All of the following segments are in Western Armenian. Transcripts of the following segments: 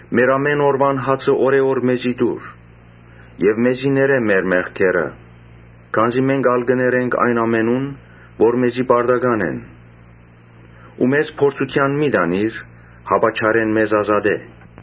Մեր ամէն օրուան հացը օրէ օր մեզի տուր Եւ մեզի ներէ մեր մեղքերը, քանզի մենք ալ կը ներենք այն ամենուն՝ որ մեզի պարտական են ու մեզ փորձութեան մի տանիր, հապա չարէն մեզ ազատէ՝ ՝»։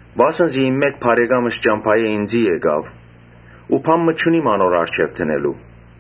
Վասն զի իմ մէկ բարեկամս ճամբայէն ինծի եկաւ ու բան մը չունիմ անոր առջեւ դնելու»։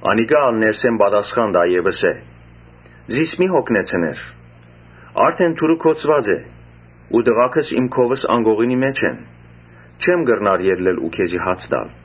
Անիկա ալ ներսէն պատասխան տայ եւ ըսէ. «Զիս մի՛ յոգնեցներ, արդէն դուռը գոցուած է ու տղաքս իմ քովս անկողնին մէջ են, չեմ կրնար ելլել ու քեզի հաց տալ»։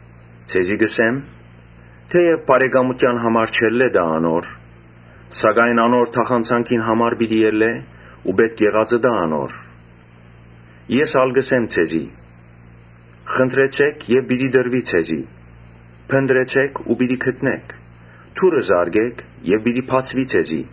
Ձեզի կ’ըսեմ. ‘Թէեւ բարեկամութեան համար չելլէ տայ անոր, սակայն անոր թախանձանքին համար պիտի ելլէ ու պէտք եղածը տայ անոր’։ Ես ալ կ’ըսեմ ձեզի. ‘Խնդրեցէք եւ պիտի տրուի ձեզի, փնտռեցէք ու պիտի գտնէք, դուռը զարկէք եւ պիտի բացուի ձեզի.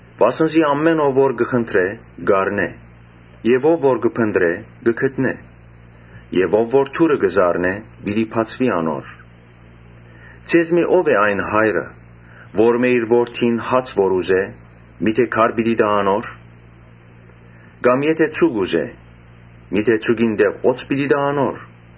Վասն զի ամէն ով որ կը խնդրէ՝ կ’առնէ եւ ով որ կը փնտռէ՝ կը գտնէ եւ ով որ դուռը կը զարնէ՝ պիտի բացուի անոր’։ ‘Ձեզմէ ո՞վ է այն հայրը, որմէ իր որդին հաց ուզէ, քար տայ անոր. կամ եթէ ձուկ ուզէ, ձուկին տեղ օձ տայ անոր.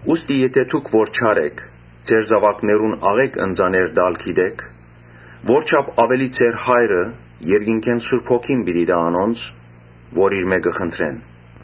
Ուստի եթէ դուք որ չար էք՝ ձեր զաւակներուն աղէկ ընծաներ տալ գիտէք, որչա՜փ աւելի ձեր Հայրը երկնքէն Սուրբ Հոգին պիտի տայ անոնց որ իրմէ կը խնդրեն»։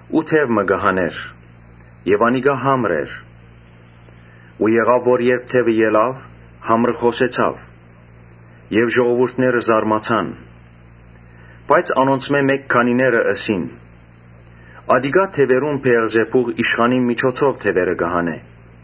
Յիսուս դեւ մը կը հանէր մէկէն՝ որ համր էր։ Երբ դեւը ելաւ, համրը խօսեցաւ եւ ժողովուրդը զարմացաւ։ Բայց անոնցմէ մէկ քանիները ըսին. «Ատիկա դեւերուն Բէեղզեբուղ իշխանին միջոցով դեւերը կը հանէ»։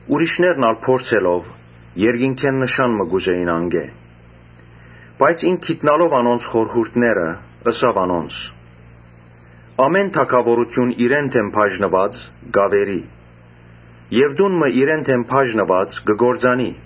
Ուրիշներ ալ փորձելով՝ երկնքէն նշան մը կ’ուզէին անկէ։ Բայց Յիսուս գիտնալով անոնց խորհուրդները՝ ըսաւ անոնց. «Ամէն թագաւորութիւն իրեն դէմ բաժնուած՝ կ’աւերի եւ տուն մը Յուն., տանիրեն դէմ բաժնուած՝ կը կործանի.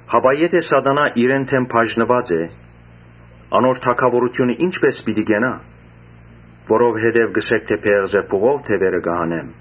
Հապա եթէ Սատանան իրեն դէմ բաժնուած է, անոր թագաւորութիւնը ի՞նչպէս պիտի կենայ, որովհետեւ կ’ըսէք թէ Բէեղզեբուղով դեւերը կը հանեմ։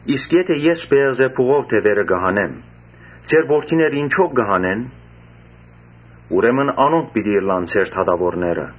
Իսկ եթէ ես Բէեղզեբուղով դեւերը կը հանեմ, ձեր որդինե՞րը ինչով կը հանեն։ Ուրեմն անոնք պիտի ըլլան ձեր դատաւորները։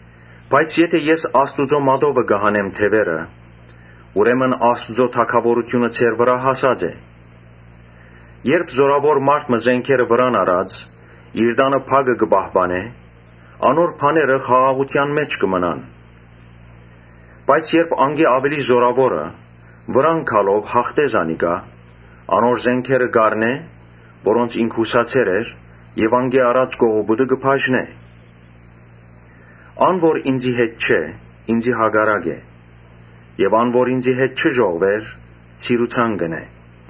Բայց եթէ ես Աստուծոյ մատովը կը հանեմ դեւերը, ուրեմն Աստուծոյ թագաւորութիւնը ձեր վրայ հասած է։ Երբ զօրաւոր մարդ մը զէնքերը վրան առած՝ իր տանը բակը պահպանէ, անոր բաները խաղաղութեան մէջ կը մնան. Բայց երբ անկէ աւելի զօրաւորը գալով յաղթէ անոր, անոր զէնքերը կ’առնէ՝ որոնց ինք յուսացեր էր եւ անկէ առած կողոպուտը կը բաժնէ։ Ան որ ինծի հետ չէ՝ ինծի հակառակ է եւ ան որ ինծի հետ չի ժողվեր՝ ցիրուցան կ’ընէ»։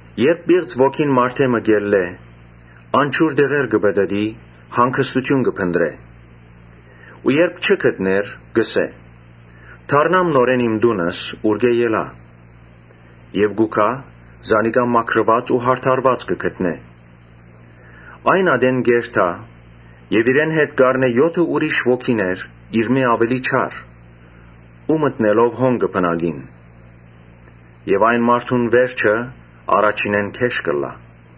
«Երբ պիղծ ոգին մարդէ մը ելլէ, անջուր տեղեր կը պտըտի, հանգստութիւն կը փնտռէ ու եթէ չգտնէ, կ’ըսէ. ‘Դառնամ նորէն իմ տունս՝ ուրկէ ելայ’։ Եւ կու գայ, զանիկա մաքրուած ու յարդարուած կը գտնէ։ Այն ատեն կ’երթայ եւ իրեն հետ կ’առնէ եօթը ուրիշ ոգիներ՝ իրմէ աւելի չար ու մտնելով հոն կը բնակին եւ այն մարդուն վերջը առաջինէն գէշ կ’ըլլայ»։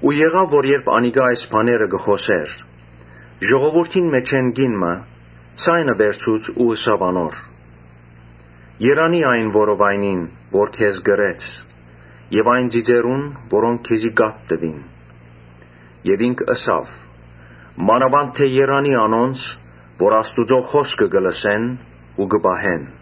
Երբ անիկա այս բաները կը խօսէր, ժողովուրդին մէջէն կին մը ձայնը վերցուց ու ըսաւ. «Երանի՜ այն որովայնին՝ որ քեզ կրեց եւ այն ծիծերուն՝ որոնք քեզի կաթ տուին»։ Իսկ ինք ըսաւ. «Մանաւանդ երանի՜ անոնց, որ Աստուծոյ խօսքը կը լսեն ու կը պահեն»։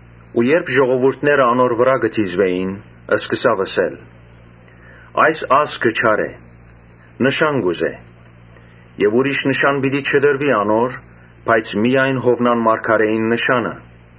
Երբ ժողովուրդը անոր վրայ կը դիզուէր, ինք ըսաւ. «Այս ազգը չար է. նշան կ’ուզէ, բայց ուրիշ նշան պիտի չտրուի անոր, միայն Յովնան մարգարէին նշանը։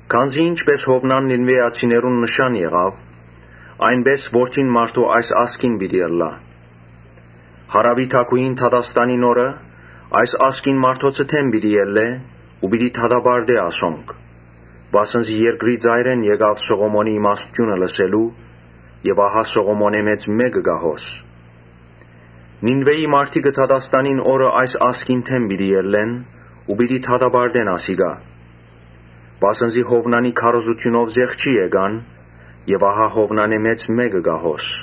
Քանզի ինչպէս Յովնան Նինուէացիներուն նշան եղաւ, այնպէս Որդին մարդոյ այս ազգին՝ պիտի ըլլայ։ Հարաւի թագուհին դատաստանին օրը այս ազգին մարդոցը դէմ պիտի ելլէ ու պիտի դատապարտէ ասոնք, վասն զի երկրի ծայրերէն եկաւ Սողոմոնին իմաստութիւնը լսելու եւ ահա Սողոմոնէն մեծ մէկը կայ հոս։ Նինուէի մարդիկը դատաստանի օրը այս ազգին դէմ պիտի ելլեն ու պիտի դատապարտեն ասիկա, վասն զի Յովնանին քարոզութիւնով զղջացին եւ ահա Յովնանէն մեծ մէկը կայ հոս»։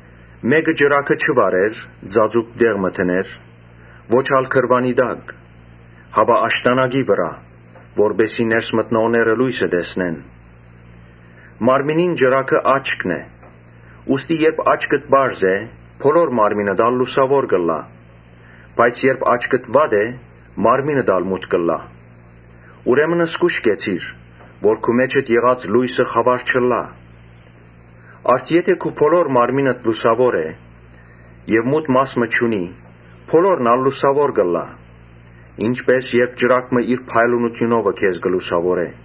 «Մէկը ճրագը չի վառեր ու ծածուկ տեղ մը դներ, ո՛չ ալ գրուանի տակ, հապա աշտանակի վրայ, որպէս զի ներս մտնողները լոյսը տեսնեն։ Մարմնին ճրագը աչքն է, ուստի երբ աչքդ պարզ է, բոլոր մարմինդ ալ լուսաւոր կ’ըլլայ, բայց երբ աչքդ վատ է, մարմինդ ալ մութ կ’ըլլայ։ Ուրեմն զգոյշ կեցիր, որ քու մէջդ եղած լոյսը խաւար չըլլայ։ Արդ՝ եթէ քու բոլոր մարմինդ լուսաւոր է եւ մութ մաս մը չունի, բոլորն ալ լուսաւոր կ’ըլլայ. ինչպէս երբ ճրագ մը իր փայլունութիւնովը քեզ լուսաւորէ»։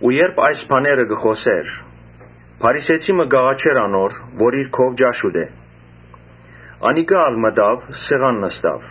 Երբ այս բաները կը խօսէր, փարիսեցի մը կ’աղաչէր անոր, որ իր քով ճաշ ուտէ։ Անիկա ալ մտաւ եւ սեղան նստաւ։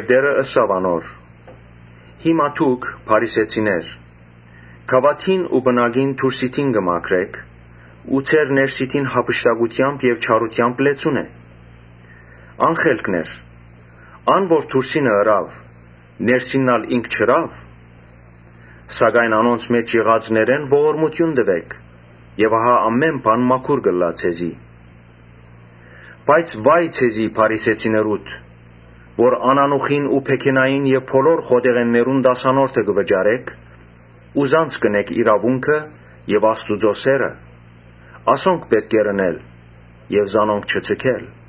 Տէրը ըսաւ անոր. «Հիմա դուք՝ փարիսեցիներ, գաւաթին ու պնակին դուրսիդին կը մաքրէք, բայց ձեր ներսիդին յափշտակութեամբ եւ չարութեամբ լեցուն է։ Ա՛նխելքներ, ան որ դուրսինը ըրաւ, ներսինն ալ ինք չըրա՞ւ։ Սակայն անոնց մէջ եղածներէն ողորմութիւն տուէք եւ ահա ամէն բան մաքուր կ’ըլլայ ձեզի»։ «Բայց վա՜յ ձեզի փարիսեցիներուդ, որ անանուխին ու փեգենային եւ բոլոր խոտեղէններուն տասանորդը կը վճարէք, բայց զանց կ’ընէք իրաւունքը եւ Աստուծոյ սէրը. ասոնք պէտք է ընէիք եւ զանոնք չձգէիք։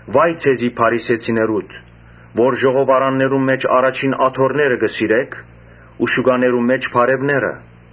Վա՜յ ձեզի փարիսեցիներուդ, որ ժողովարաններուն մէջ առաջին աթոռները կը սիրէք ու շուկաներուն մէջ՝ բարեւները։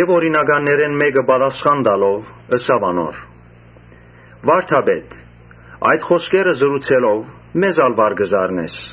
Օրինականներէն մէկը պատասխան տալով՝ ըսաւ անոր. «Վա՛րդապետ, այդ խօսքերը ըսելով՝ մեզ ալ վար կը զարնես»։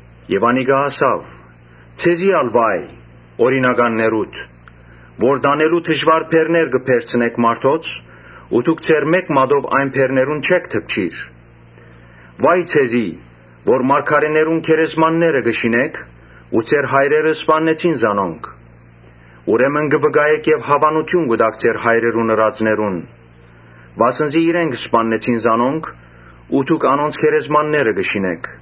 Անիկա ըսաւ. «Ձեզի ալ վա՜յ օրինականներուդ, որ տանելու դժուար բեռներ կը բեռցնէք մարդոց ու դուք ձեր մէկ մատով այն բեռներուն չէք դպչիր։ Վա՜յ ձեզի, որ մարգարէներուն գերեզմաններ կը շինէք, մինչդեռ ձեր հայրերը սպաննեցին զանոնք։ Ուրեմն կը վկայէք եւ հաւանութիւն կու տաք ձեր հայրերուն ըրածներուն. վասն զի իրենք սպաննեցին զանոնք ու դուք անոնց գերեզմաններ կը շինէք։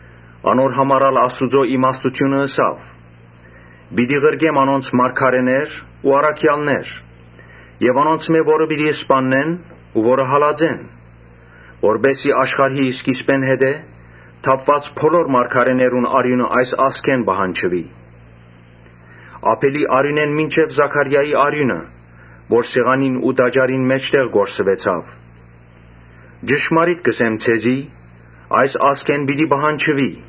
Անոր համար ալ Աստուծոյ իմաստութիւնը ըսաւ. ‘Պիտի ղրկեմ անոնց մարգարէներ ու առաքեալներ։ Անոնցմէ ոմանքը պիտի սպաննեն ու ոմանքը հալածեն, Որպէս զի աշխարհի սկիզբէն ի վեր թափուած բոլոր մարգարէներուն արիւնը այս ազգէն պահանջուի։ Աբէլին արիւնէն մինչեւ Զաքարիային արիւնը, որ սեղանին ու տաճարին մէջտեղ թափուեցաւ՝ ճշմարիտ կ’ըսեմ ձեզի, այս ազգէն պիտի պահանջուի’։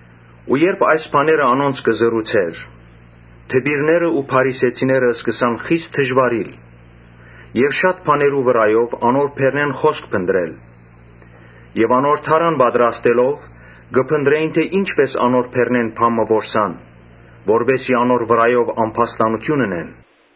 Երբ այս բաները անոնց կ’ըսէր, դպիրներն ու փարիսեցիները սկսան խիստ նեղանալ եւ շատ բաներու վրայով անոր բերնէն խօսք փնտռել։ Անոր դարան պատրաստելով, կը փնտռէին թէ ի՞նչպէս անոր բերնէն բան մը որսան, որպէս զի անոր վրայով ամբաստանութիւն ընեն։